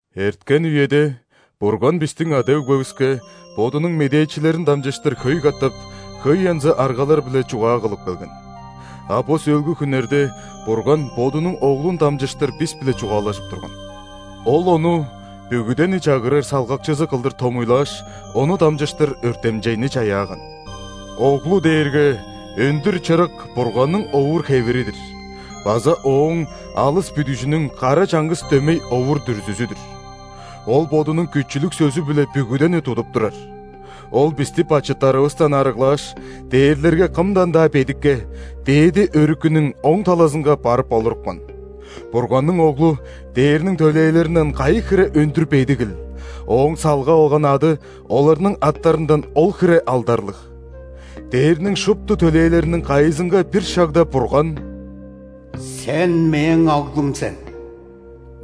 Эрткен үеде Бурган бистиң ада-өгбевиске Бодунуң медээчилерин дамчыштыр хөй катап, хөй янзы аргалар-биле чугаа кылып келген. А бо сөөлгү хүннерде Бурган Бодунуң Оглун дамчыштыр бис-биле чугаалажып турган. Ол Ону бүгүдени чагырар салгакчызы кылдыр томуйлааш, Ону дамчыштыр өртемчейни чаяаган. Оглу дээрге өндүр чырык Бурганның овур-хевири-дир база Ооң алыс бүдүжүнүң кара чаңгыс дөмей овур-дүрзүзү-дүр. Ол Бодунуң күчүлүг сөзү-биле бүгүдени тудуп турар. Ол бисти бачыттарывыстан арыглааш, дээрлерге кымдан-даа бедикке, Дээди Өрүкүнүң оң талазынга барып олурупкан. Бурганның Оглу ·дээрниң төлээлеринден кайы хире өндүр бедигил, Ооң салгап алган ады оларның аттарындан ол хире алдарлыг. ·Дээрниң шупту төлээлериниң кайызынга бир шагда Бурган:«Сен – Мээң Оглум сен,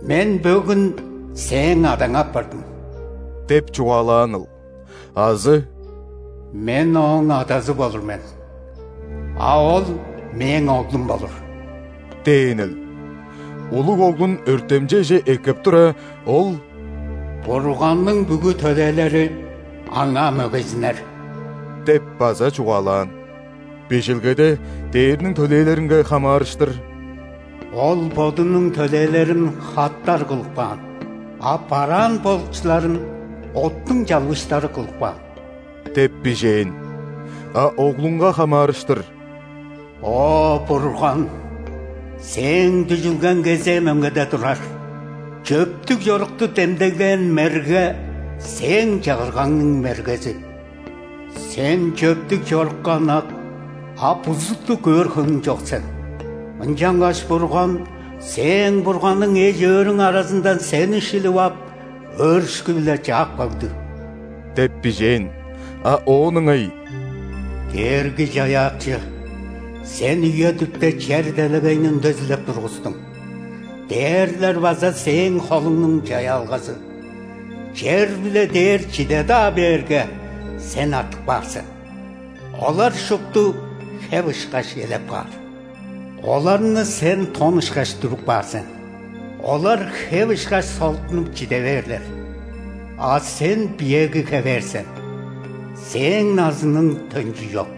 Мен бөгүн Сээң Адаң апардым» – деп чугаалааныл?Азы: «Мен Ооң Адазы болур мен, а Ол Мээң Оглум болур» – дээнил? Улуг Оглун өртемчейже эккеп тура, Ол:«Бурганның бүгү төлээлери Аңаа мөгейзиннер» – деп база чугаалаан. Бижилгеде дээрниң төлээлеринге хамаарыштыр:«Ол Бодунуң төлээлерин – хаттар кылып каан,а бараан болукчуларын – оттуң чалбыыштары кылып каан» деп бижээн. А Оглунга хамаарыштыр:«О Бурган, Сээң дүжүлгең кезээ мөңгеде турар,чөптүг чорукту демдеглээн мерге – Сээң чагыргаңның мергези. Сен чөптүг чорукка ынак, а бузутту көөр хөңнүң чок сен.Ынчангаш Бурган – Сээң Бурганың эш-өөрүң аразындан сени шилип ап,өөрүшкү-биле чаап кагды» деп бижээн. А оон ыңай:«Дээрги-Чаяакчы, Сен үе-дүпте чер-делегейни үндезилеп тургустуң,дээрлер база Сээң холуңнуң чаяалгазы. Чер биле дээр чиде-даа бээрге, Сен артып каар сен.Олар шупту хеп ышкаш элеп каар; оларны Сен тон ышкаш дүрүп каар сен,олар, хеп ышкаш, солуттунуп, чиде бээрлер.А Сен биеэги хевээр сен, Сээң назының төнчү чок»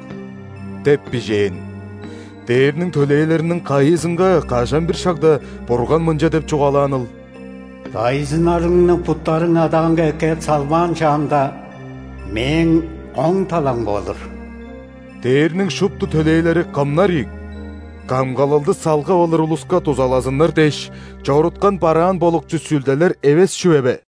деп бижээн. Дээрниң төлээлериниң кайызынга кажан-бир шагда Бурган мынча деп чугаалааныл:«Дайзыннарыңны буттарың адаанга эккеп салбаан шаамда,Мээң оң таламга олур?» Дээрниң шупту төлээлери кымнар ийик? Камгалалды салгап алыр улуска дузалазыннар дээш чоруткан бараан болукчу сүлделер эвес чүве бе?